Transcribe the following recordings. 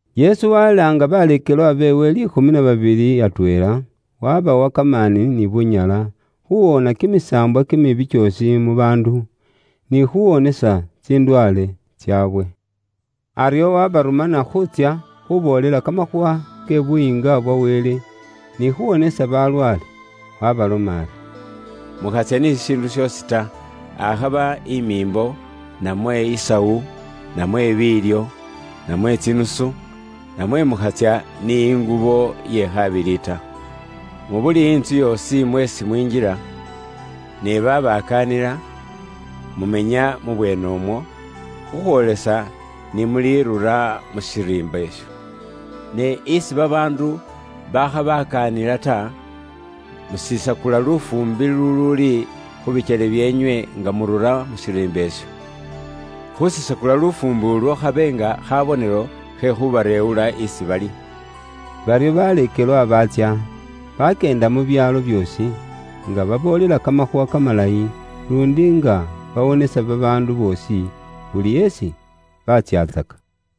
Yesu walaanga baleekelwa beewe liikhumi na babili atweela, wabawa kamaani ni bunyala, khuwoona kimisaambwa kimibi kyoosi mu baandu, ni khuwonesa tsindwaale tsaabwe. Aryo wabarumana khuutsya khuboolela kamakhuuwa ke Buyiinga bwa Wele, ni khuwonesa balwaale. Wabaloma ari, “Mukhatsya ni shishiindu shoosi ta, akhaba imiimbo, namwe isawu, namwe biilyo, namwe tsinusu, namwe mukhatsya ni ingubo ye khabili ta. Mu buli intsu yoosi mweesi mwinjila, ne babakaanila, mumenya mu bweenemwo, khukhwoolesa ni mulirura mu shiriimba isho. Ne isi babaandu bakhabakaanila ta, musisakula lufuumbi luluuli khu bikyele byeenywe nga murura mu shiriimba isho. Khusisakula lufuumbi ulwo khabe nga khabonelo khe khubareewula isi bali.” Baryo baleekelwa baatsya, bakyeenda mu byaalo byoosi, nga baboolela Kamakhuuwa Kamalayi, luundi nga bawonesa babaandu boosi, buli esi batsyatsaka.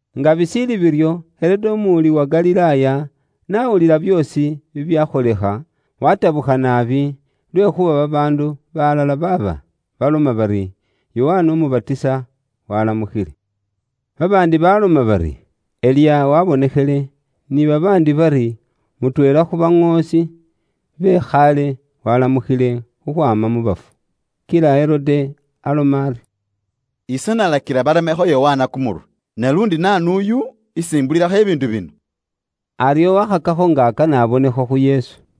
Nga bishiili biryo, Herode umuwuli wa Galilaaya, n'awulila byoosi bibyakholekha, watabukha naabi, lwekhuuba babaandu balala baaba baloma bari, Yokana Umubatisa waalamukhile. Babaandi baloma bari, Eliya waabonekhele, ni babaandi bari, mutweela khu baŋoosi be khaale waalamukhile khukhwaama mu bafu. Kila Herode aloma ari, “Ise nalakila baremakho Yokana kumurwe, ne luundi naanu uyu, isi mbulilakho bibiindu bino?” Aryo wakhakakho nga akana abonekho khu Yesu.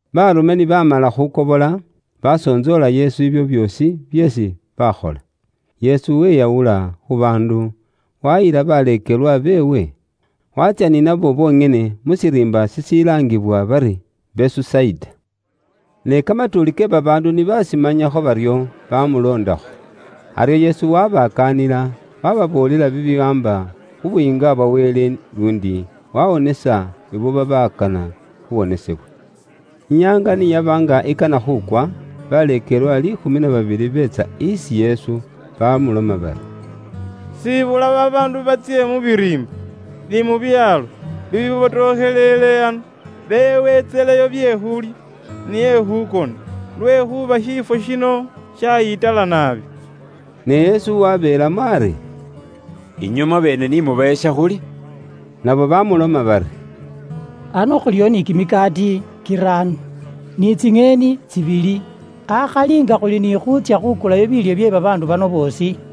Baarume ni baamala khukobola, basontsoola Yesu ibyo byoosi byeesi baakhola. Yesu weyawula khu baandu, wayila baleekelwa beewe, waatsya ni nabo bonyene mu shiriimba shishilaangibwa bari Besusaida. Ne kamatuuli ke babaandu ni bashimanyakho baryo, bamuloondakho. Aryo Yesu wabakaanila, waababoolela bibiwaamba khu Buyiinga bwa Wele, luundi wawonesa ibo babakana khuwonesebwa. Inyaanga ni yaba nga ikana khukwa, baleekelwa liikhumi na babili beetsa isi Yesu, bamuloma bari, “Siibula babaandu batsye mu biriimba, ni mu byaalo, bibibotokhelele ano, beeweentseleyo bye khuulya, ni ekhukona. Lwekhuuba shiifwo shino shayitala naabi.” Ne Yesu wabeelamo ari, “Inywe mwabeene ni mubawe shakhulya.” Nabo bamuloma bari, “Ano khuliwo ni kimikaati kiraano, ni tsinyeeni tsibili, akhali nga khuli ni khuutsya khukulayo biilyo bye babaandu bano boosi.”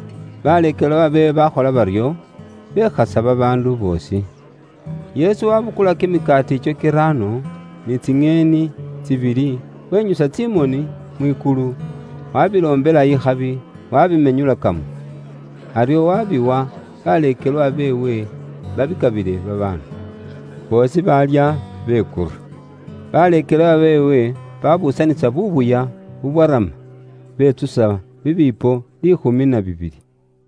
Baleekelwa beewe baakhola baryo, bekhasa babaandu boosi. Yesu waabukula kimikaati ikyo kiraano, ni tsinyeeni tsibili, wenyusa tsimoni mwikulu, waabiloombela ikhabi, waabimenyulakamo. Aryo waabiwa baleekelwa beewe, baabikabile babaandu. Boosi baalya, bekura. Baleekelwa beewe baabuusanisa buubuya bubwarama, betsusa bibiipo liikhumi na bibili.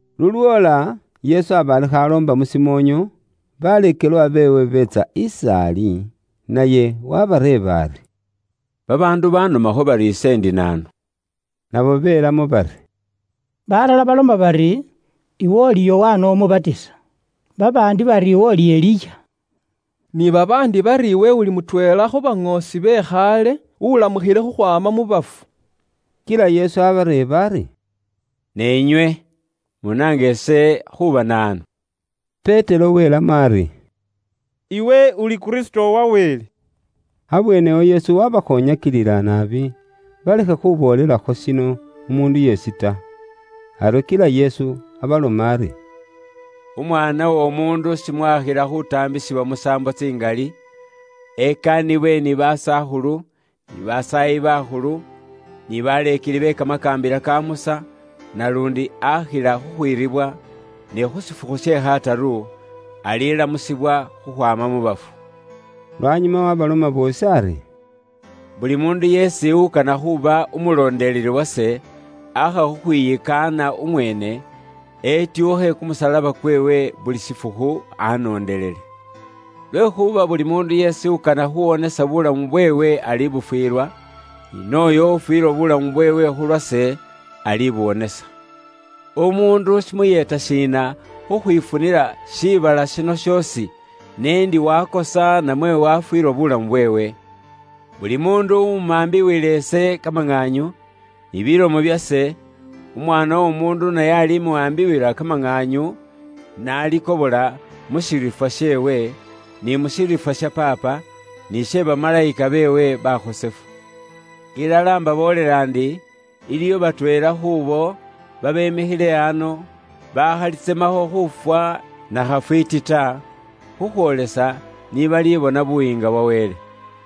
Lulwoola Yesu aba ali khuuloomba mu shimoonyo, baleekelwa beewe beetsa is'ali, naye wabareeba ari, “Babaandu banomakho bari ise ndi naanu.” Nabo belamo bari, “Balala baloma bari, iwe uli Yokana Umubatisa, babaandi bari iwe uli Eliya, ni babaandi bari, iwe uli mutweela khu baŋoosi be khaale ulamukhile khukhwaama mu bafu.” Kila Yesu abareeba ari, “Ne inywe? Munaanga ise khuuba naanu?” Petero welamo ari, “Iwe Uli Kristo wa Wele.” Abweenewo Yesu waabakhoonyakilila naabi, balekhe khuboolelakho shino umuundu yeesi ta. Aryo kila Yesu abaloma ari, “Umwaana w'Omuundu shimwaakhila khuutaambisibwa musaambo tsingali, basakhulu ni basaayi bakhulu, ni baleekeli be Kamakaambila ka Musa bamwikaane. Bali mwiira, ne khu shifukhu she kataru, alilamusibwa khukhwaama mu bafu.” Lwanyuma waabaloma boosi ari, “Buli muundu yeesi ukana khuuba umulondeleli wase, aakha khukhwiyikaana umweene, etyuukhe kumusalaba kweewe buli shifukhu anoondelele. Lwekhuuba buli muundu yeesi ukana khuuwonesa buulamu bweewe alibufwilwa, ni nooyo ufwiilwa buulamu bweewe khu lwase, alibuwonesa. Umuundu shimuyeeta shiina khukhwifunila shiibala shino shoosi, n'endi wakosa namwe wafwiilwa buulamu bweewe? Buli muundu uwumambiwila ise kamaŋaanyu, ni bilomo byase, Umwaana w'Omuundu naye alimuwaambiwila kamaŋaanyu n'alikobola mu shiriifwa sheewe, ni mu shiriifwa sha Paapa, ni she bamalayika beewe bakhosefu. Ilala mbaboolela ndi, iliwo batweela khuubo babemikhile ano, bakhalitsemakho khuufwa na khafwiiti ta, khukhwoolesa ni balibona Buyiinga bwa Wele.”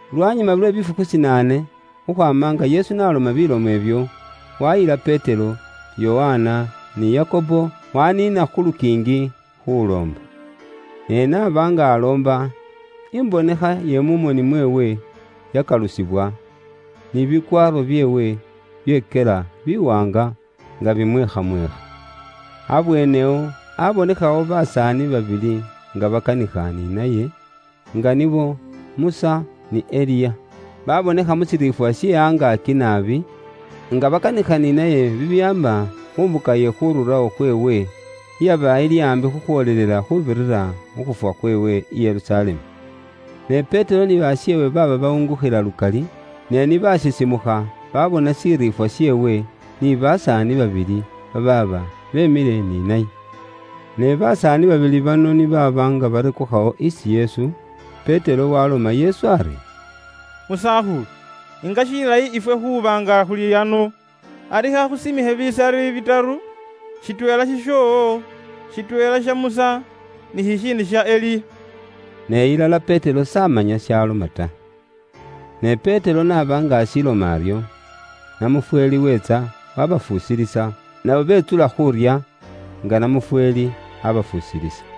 Lwanyuma lwe bifukhu shinaane khukhwaama nga Yesu n'aloma bilomo ibyo, wayila Petero, Yokana, ni Yakobo, waniina khu lukiingi, khuloomba. Ne n'aba nga aloomba, imbonekha ye mu moni mweewe yakalusibwa, ni bikwaaro byeewe byekyela biwaanga nga bimweekhamweekha. Abweenewo abonekhawo basaani babili nga bakanikha ni naye; nga nibo Musa, ni Eliya. Babonekha mu shiriifwa she angaaki naabi, nga bakanikha ni naye bibiwaamba khu mbuka iye khururawo khweewe, iyaba ili aambi khukhwoolelela khuubirira mu khuufwa khweewe i Yerusalemu. Ne Petero ni basheewe baaba bawungukhila lukali, ne ni basisimukha, babona shiriifwa sheewe, ni basaani babili babaaba beemile ni naye. Ne basaani babili bano ni baaba barekukhawo isi Yesu, Petero waloma Yesu ari, “Musakhulu nga shilayi ifwe khuuba nga khuli ano! Ari khakhusimikhe bisari bitaru; shitweela shishoowo, shitweela sha Musa, ni shishiindi sha Eliya.” (Ne ilala Petero s'amanya shaloma ta). Ne Petero n'aba nga ashiloma aryo, namufweeli weetsa wabafusilisa, nabo betsula khuurya, nga namufweeli abafusilisa.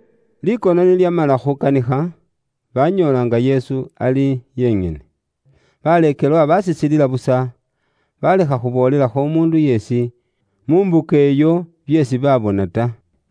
Likono ni lyamala khukanikha, banyoola nga Yesu ali yenyene. Baleekelwa bashisilila busa, balekha khuboolelakho umuundu yeesi, mu mbuka iyo byeesi baabona ta.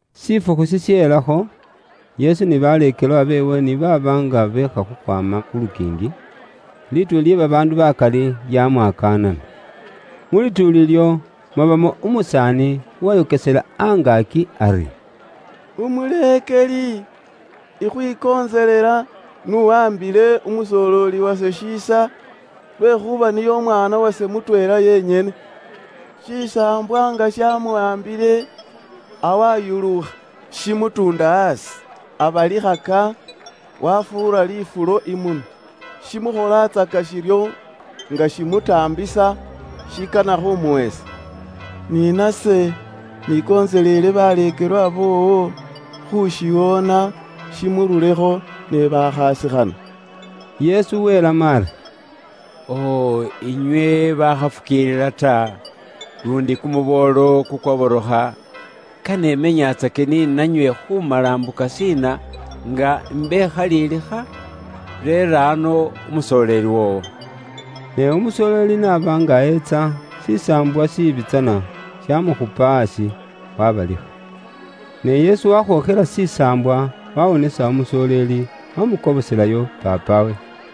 Shifukhu shishelakho, Yesu ni baleekelwa beewe ni baaba nga beekha khukhwaama khu lukiingi, lituuli lye babaandu bakali lyamwakaanana. Mu lituuli ilyo, mwabamo umusaani uwayokesela angaaki ari, “Umuleekeli, ikhwikontselela, n'uwaambile umusoleeli wase shiisa lwekhuuba niye umwaana wase mutweela yenyene. Shisaambwa nga shamuwaambile, awayuluukha, shimutuunda aasi, abalikhaka, wafuura lifulo imunwa. Shimukholatsaka shiryo, nga shimutaambisa, shikana khumuwesa. Ni nase nikontseleele baleekelwa boowo khushiwoona shimururekho, ne bakhasikhana.” Yesu welamo ari, “O inywe bakhafukiilila ta, luundi kumuboolo kukwaborokha, kane imenyatsake ni nanywe khumala mbuka shiina nga imbekhalilikha? Reera ano umusoleeli woowo.” Ne umusoleeli n'aba nga etsa, shisaambwa shiibi tsana shamukhupa aasi, wabalikha. Ne Yesu wakhookhela shisaambwa, wawonesa umusoleeli, wamukoboselayo paapawe.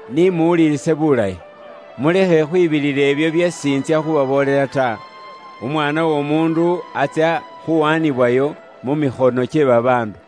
“Ni muwulilise bulayi, mulekhe khwibilila ibyo byeesi intsya khubaboolela ta: Umwaana w'Omuundu atsya khuwaanibwayo mu mikhono kye babaandu.”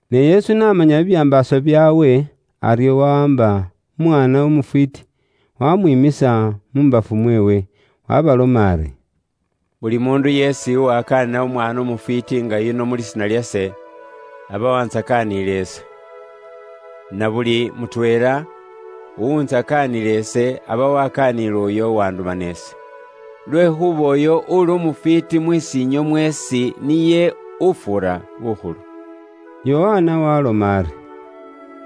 Ne Yesu n'amanya bibyambaaso bye mu myoyo kyaabwe, aryo wawaamba umwaana umufwiiti, wamwiimisa mu mbafu mweewe, waabaloma ari, “Buli muundu yeesi uwakaanila umwaana umufwiiti nga yuno mu lisiina lyase, aba waantsakaanile ise. Na buli mutweela uwuntsakaanila ise aba wakaaniile uyo uwanduma ise. Lwekhuuba uyo uuli umufwiiti mus'iinywe mweesi niye ufuura bukhulu.” Yokana waaloma ari,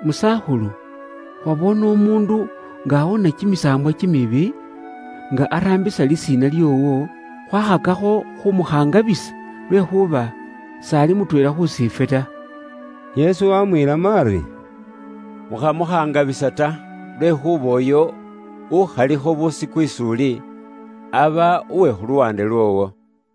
“Musakhulu, khwaboone umuundu nga awoona kimisaambwa kimibi, nga araambisa lisiina lyoowo, khwakhakakho khuumukhangabisa, lwekhuuba s'ali mutweela khusiifwe ta.” Yesu waamwiilamo ari, “Mukhamukhangabisa ta, lwekhuuba uyo ukhalikho busiku is'uli, aba uwe khu luwaande lwoowo.”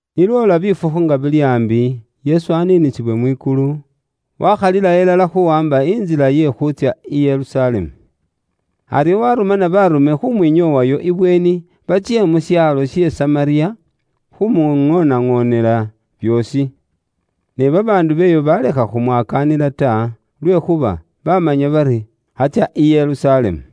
Ni lwoola bifukhu nga bili aambi, Yesu aniinisiwe mwikulu, waakhalilawo ilala khuuwaamba intsila iye khuutsya i Yerusalemu. Aryo waarumana baarume khumwinyoowayo ibweeni, batsye mu shaalo she Samariya, khuumuŋoonaŋoonela byoosi. Ne babaandu b'eyo baalekha khumwakaanila ta, lwekhuuba baamanya bari, atsya i Yerusalemu.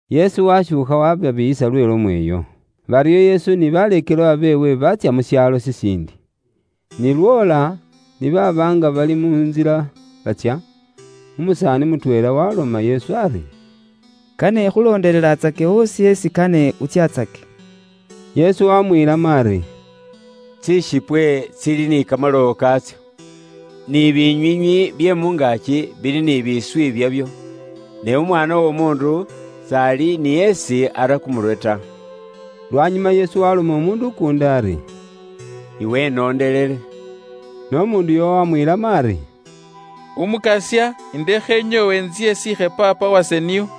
Yesu washuukha waababiiyisa lwe lomo iyo. Baryo Yesu ni baleekelwa beewe baatsya mu shaalo shishiindi. Ni lwoola, ni baaba nga bali mu ntsila batsya, umusaani mutweela waloma Yesu ari, “Kane ikhuloondelelatsake oosi isi kane utsyatsake.” Yesu waamwiilamo ari, “Tsishipwe tsili ni kamalowo kaatso, ni binywiinywi bye mu ngaaki bili ni biiswi byabyo, ne Umwaana w'Omuundu s'ali ni isi ara kumurwe ta.” Lwanyuma Yesu waaloma umuundu ukuundi ari, “Iwe inoondelele.” Ne umuundu uyo waamwiilamo ari, “Umukasya, ndekhe inyoowe intsye isiikhe paapa wase nio.”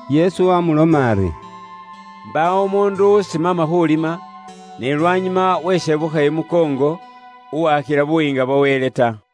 Yesu waamuloma ari, “Mbaawo umuundu ulimisa n'imbako iye tsikhaafu, ne weshebukhaka imukoongo, s'akhila Buyiinga bwa Wele ta.”